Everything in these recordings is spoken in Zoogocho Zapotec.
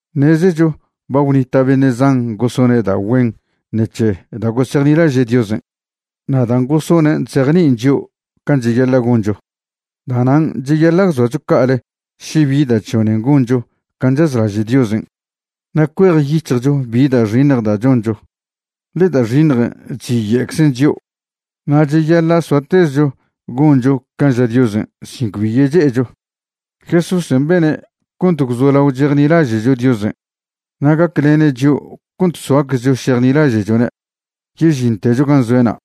Ṉezecho ba gwnita' beṉe' zan gosone' da' güen ṉec̱he da' gosejnilaže' Diosen', na' dan' gosonen' chzejni'in chio' can' cheyaḻa' goncho. Da'nan' cheyaḻa' gwzoacho ca'ale še bi da' chžonen goncho can' chazlaže' Diosen' na' cuejyic̱hjcho bi da' xiṉj da' choncho, ḻe da' xiṉjen' chziye'czen chio'. Na' cheyaḻa' soatezcho goncho can' ža Diosen' sin cbi yeche'echo. Jesúsen' bene' cont gwzolao chejnilaže'cho Diosen' na' gaclene' chio' cont soaczcho šejnilaže'chone' yežintecho gan' zoe'na'.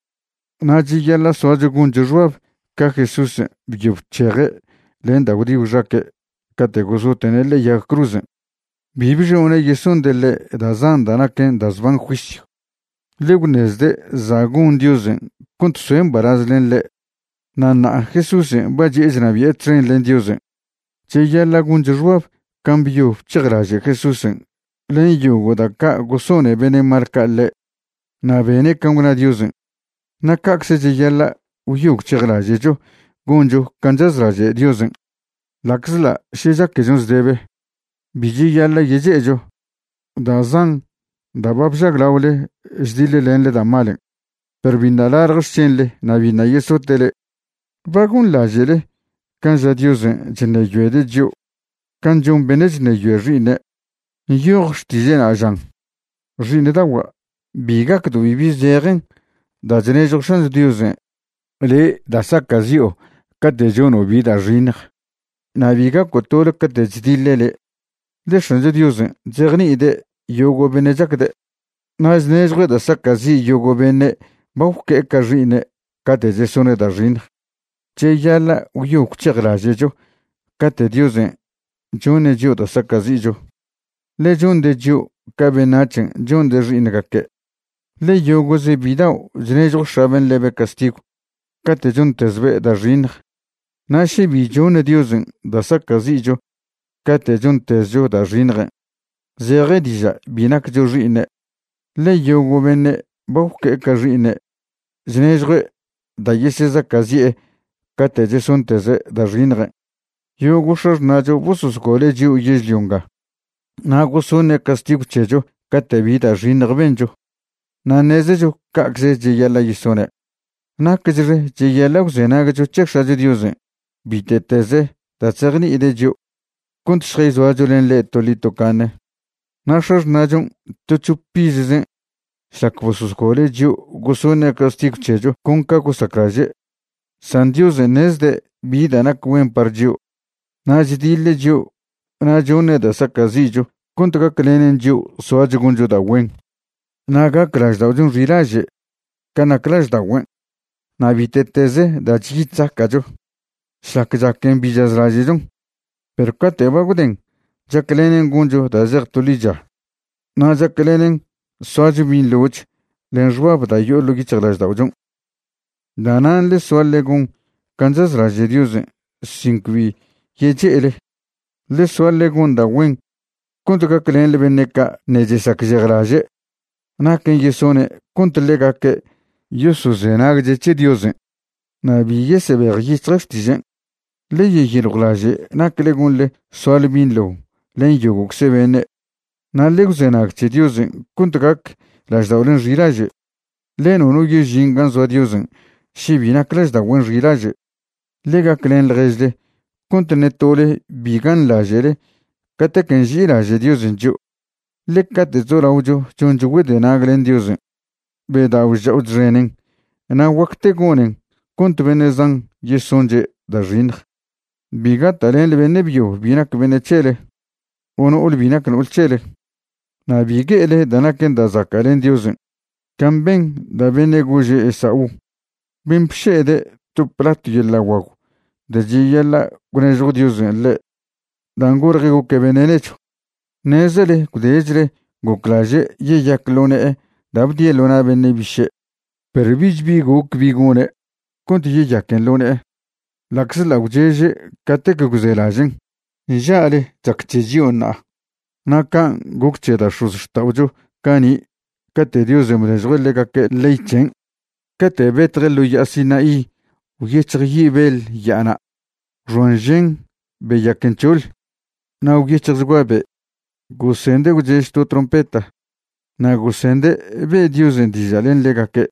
Na' cheyaḻa' soacho goncho xbab ca Jesúsen' byo bc̱heje' len da' gwdi gwxaque' cate' gosote'ne' ḻe'e yag cruzen'. Bi bžone' yesonde' ḻe' da' zan da' naquen da' zban juisyw, ḻe gwṉezde' za' gon Diosen' cont soe' mbalaz len ḻe'. Na' ṉa'a Jesúsen' ba chi'e chnabi'e txen len Diosen'. Cheyaḻa' goncho xbab can' byo bc̱hejlaže' Jesúsen' len yogo' da' ca' gosone beṉe' mal ca' ḻe' na' bene' can' gwna Diosen'. Na' ca'cze cheyaḻa' gwyo gwc̱hejlaže'cho goncho can' chazlaže' Diosen' ḻa'czḻa' še chaquechon zdebe; bi cheyaḻa' yeche'echo. Da' zan da' ba bžaglaole chdiḻlenḻe da' malen', perw biṉa' lalj xc̱henḻe na' biṉa' yesote' le'e. ¿Ba gonḻaže'le can' ža Diosen' chṉeyoede' chio' can' chon beṉe' chṉeyoe xi'iṉe'? Nyoj xtiže'na', žan: Xi'iṉdagua', bi gacdo' bibi zejen da' chnežjo X̱ancho Diosen' le' da' saca'zi'o' cate' chono' bi da' xiṉj, na' bi gaco' tole cate' chdiḻe' le'. Ḻe X̱ancho Diosen' chzejni'ide' yogo' beṉe' chacde', na' chnežjue' da' saca'zi' yogo' beṉe' ba gwque'e ca xi'iṉe' cate' chesone' da' xiṉj. Cheyaḻa' gwyo gwc̱hejlaže'cho cate' Diosen' choṉe' chio' da' saca'zi'cho, ḻe chonde' chio' ca beṉac̱hen' chonde' xi'iṉgaque'. Ḻe yogo'ze bidao' chnežjo x̱aben' ḻebe' castigw cate' chontezbe' da' xiṉj. Na' še bi choṉ Diosen' da' saca'zi'cho cate' chontezcho da' xiṉjen', zeje diža' bi naccho xi'iṉe', ḻe yogo' beṉe' ba gwque'e ca xi'iṉe' chnežjue' da' yesezaca'zi'e cate' chesonteze' da' xiṉjen'. Yogo' x̱axṉa'cho bososgole' chio' yežlio nga na' gosoṉe' castigw c̱hecho cate' bi da' xiṉj bencho, na' ṉezecho ca'cze cheyaḻa' yesone'. Nacchxe cheyaḻa' gwzenagcho c̱he X̱acho Diosen' bite'teze da' chzejni'ide' chio', cont šjayzoacho len ḻe' toḻi tocaṉe. Na' x̱axṉa'chon' to c̱hop izzen' šlac bososgole' chio' gosoṉe' castigw c̱hecho con ca gosaclaže'. San Diosen' ṉezde' bi da' nac güen par chio', na' chdiḻe' chio' na' choṉe' da' saca'zi'cho cont gaclenen chio' soacho goncho da' güen na' gac lažda'ochon' xilaže' can' nac lažda'ogüen'. Na' bite'tez da' chyi chzaca'cho, šlac chaquen bi chazlaže'chon, perw cate' ba gwden chaclenen goncho da' zej to ḻicha na' chaclenen soacho binḻoch len xbab da' yo'o ḻo' yic̱hjlažda'ochon'. Da'nan' ḻe soa ḻe gon can' chazlaže' Diosen' sin cbi yeche'ele. Ḻe soa ḻe gon da' güen cont gaclenḻe beṉe' ca' ṉe' chesacžejlaže' naquen' yesone' cont ḻegaque' yosozenagche' c̱he Diosen' na' bi yesebejyic̱hje' xtižen'. Ḻe yeyiljwlaže' nacle gonḻe soale binḻo len yogo'cze beṉe', na' ḻe gwzenag c̱he Diosen' cont gac lažda'olen' xilaže', ḻe nono yežin gan' zoa Diosen' še bi nac lažda'ogüen' xilaže'. Ḻe gaclen ḻježle cont ṉe tole bi ganḻaže'le catequen' nži'ilaže' Diosen' chio', ḻe cate' chzolaocho choncho güedenag len Diosen', bedao' chc̱ha'o chxenen na' guacte gonen cont beṉe' zan yesonche' da' xiṉj. Bi gata'lenḻe beṉe' byo bi nac beṉe' c̱hele o no'ole bi nac no'ol c̱hele. Na' bi gue'ele da' naquen da' zaca' len Diosen' can' ben da' bene' gože' Esaú, ben' bše'ede' to platw yeḻa' guagw da' cheyaḻa' gwnežjo Diosen' ḻe' dan' golje' goque' beṉe' nechw. Ṉezele gwdechle goclaže' yeyac ḻo ne'e da' bdie' ḻo na' beṉe' biše', perw bich bi goc bi gone' cont yeyaquen ḻo ne'e ḻa'czḻa' gwcheže' catec gwzelažen'. Nža'le chac c̱he chio' ṉa'a na' can' goc c̱he da' x̱ozxta'ocho cani' cate' Diosen' bnežjue' ḻegaque' ley c̱hen'. Cate' betje' ḻo ya'a Sinaí gwyec̱hj yi' beḻ ya'ana', gwxoan žen, beyaquen c̱hoḻ, na' gwyec̱hjchgua be'. Gosende' gwchež to trompeta, na' gosende' be' Diosen' diža' len ḻegaque'.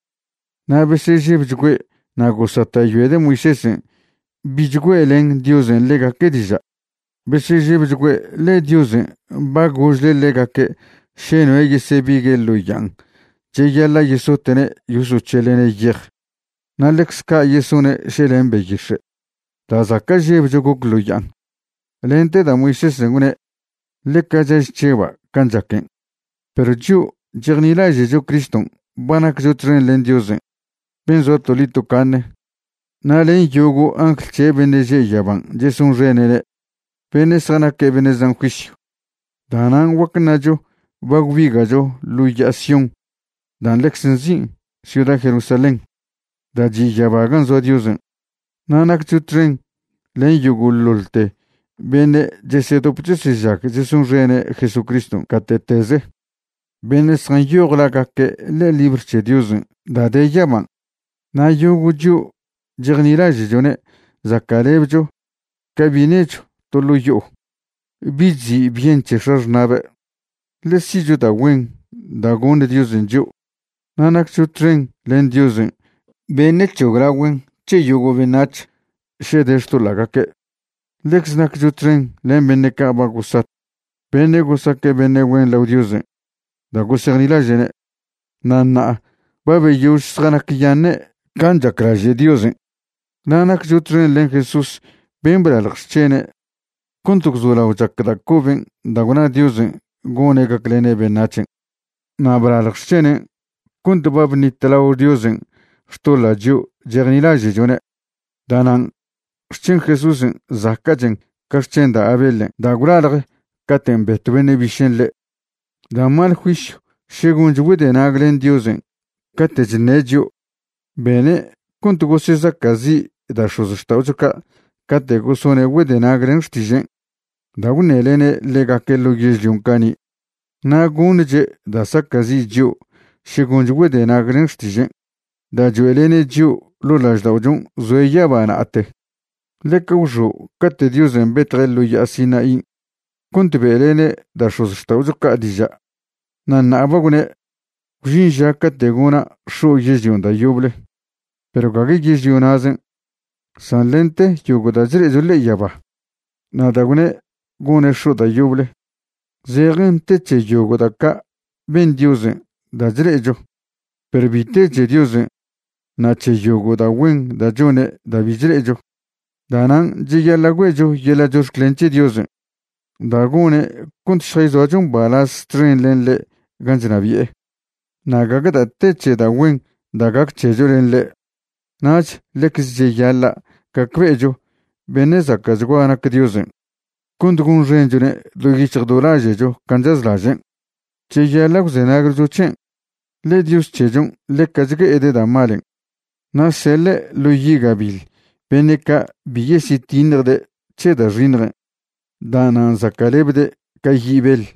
Na' besežebchgüe' na' gosata'yoede' Moisésen' bich güe'len Diosen' ḻegaque' diža'. Besežebchgüe', ḻe Diosen' ba gožle' ḻegaque' še noe' yesebigue' ḻo ya'an cheyaḻa' yesote'ne' yosoc̱heḻe'ne' yej, na' ḻecz ca' yesone' še len beyix̱e'. Da' zaca' žebcho goc ḻo ya'an, lente da' Moisésen' gwne': “Ḻeca chaž chžeba' can' chaquen'.” Perw chio' chejnilaže'cho Criston' ba naccho txen len Diosen' ben' zoa toḻi tocaṉe na' len yogo' angl c̱he' beṉe' že' yaban' chesonxene'ne', beṉe' zjanaque' beṉe' zan juisyw. Da'nan' guac ṉacho ba gwbiga'cho ḻo ya'a Sión dan' ḻecze nzin' ciuda Jerusalén da' chi' yaba gan' zoa Diosen'. Na' naccho txen len yogo'ḻoḻte beṉe' chesedop chesežag chesonxene' Jesucriston' gate'teze, beṉe' zjanyoj lagaque' ḻe'e libr c̱he Diosen' da' de yaban'. Na' yogo' chio' chejnilaže'chone' zaca'lebcho ca bi' nechw to ḻo' yo'o, bi' chzi' byen c̱he x̱axṉa'be', ḻe si'cho da' güen da' goṉ Diosen' chio'. Na' naccho txen len Diosen' beṉe' c̱hoglaogüen' c̱he yogo' beṉac̱h še de xtoḻa'gaque'. Ḻecze naccho txen len beṉe' ca' ba gosat, beṉe' gosaque' beṉe' güen lao Diosen' da' gosejnilaže'ne', na' ṉa'a ba beyož zjanacyaṉe' can' chaclaže' Diosen'. Na' naccho txen len Jesús ben' blalj xc̱hene' cont gwzolao chac da' coben' da' gwna Diosen' gone' gaclene' beṉac̱hen'. Na' blalj xc̱henen' cont ba bṉitlao Diosen' xtoḻa' chio' chejnilaže'chone'. Da'nan' xc̱hen Jesúsen' zaca'chen ca xc̱hen da' Abelen' da' gwlalj caten' betw beṉe' bišen' ḻe'. Da' mal juisyw še goncho güedenag len Diosen' cate' chṉe' chio'. Bene' cont gosezaca'zi' da' x̱ozxta'ocho ca' cate' gosone' güedenag len xtižen' da' gwṉelene' ḻegaque' ḻo yežlion' cani', na' goṉche' da' saca'zi' chio' še goncho güedenag len xtižen' da' choe'lene' chio' ḻo' lažda'ochon' zoe' yaba na'ate. Ḻeca gwxo' cate' Diosen' betje' ḻo ya'a Sinaín' cont be'lene' da' x̱ozxta'ocho ca' diža'. Na' ṉa'a ba gwne': “Gwžin ža cate' gona' x̱o' yežlion' da' yoble, perw gague yežlio na'zen', san lente yogo' da' chle'echo ḻe'e yaba.” Na' da' gwne' gone' x̱o' da' yoble, zejen te c̱he yogo' da' ca' ben Diosen' da' chle'echo, perw bi te c̱he Diosen' na' c̱he yogo' da' güen da' chone' da' bi chle'echo. Da'nan' cheyaḻa' güe'cho yeḻa' chox̱clen c̱he Diosen' da' gone' cont šjayzoacho mbalaz txen len ḻe' gan' chnabi'e, na' gague da' te c̱he da' güen da' gac c̱hecho len ḻe'. Nach ḻecz cheyaḻa' gacbe'echo beṉe' zaca'chgua nac Diosen' cont gonxenchone' do yic̱hj do laže'cho can' chazlažen'. Cheyaḻa' gwzenagcho c̱hen', ḻe Dios c̱hechon' ḻeca chgue'ede' da' malen', na' seḻe' ḻo yi' gabiḻ beṉe' ca' bi yesyetiṉjde' c̱he da' xiṉjen', da'nan' zaca'lebde' ca yi' beḻ.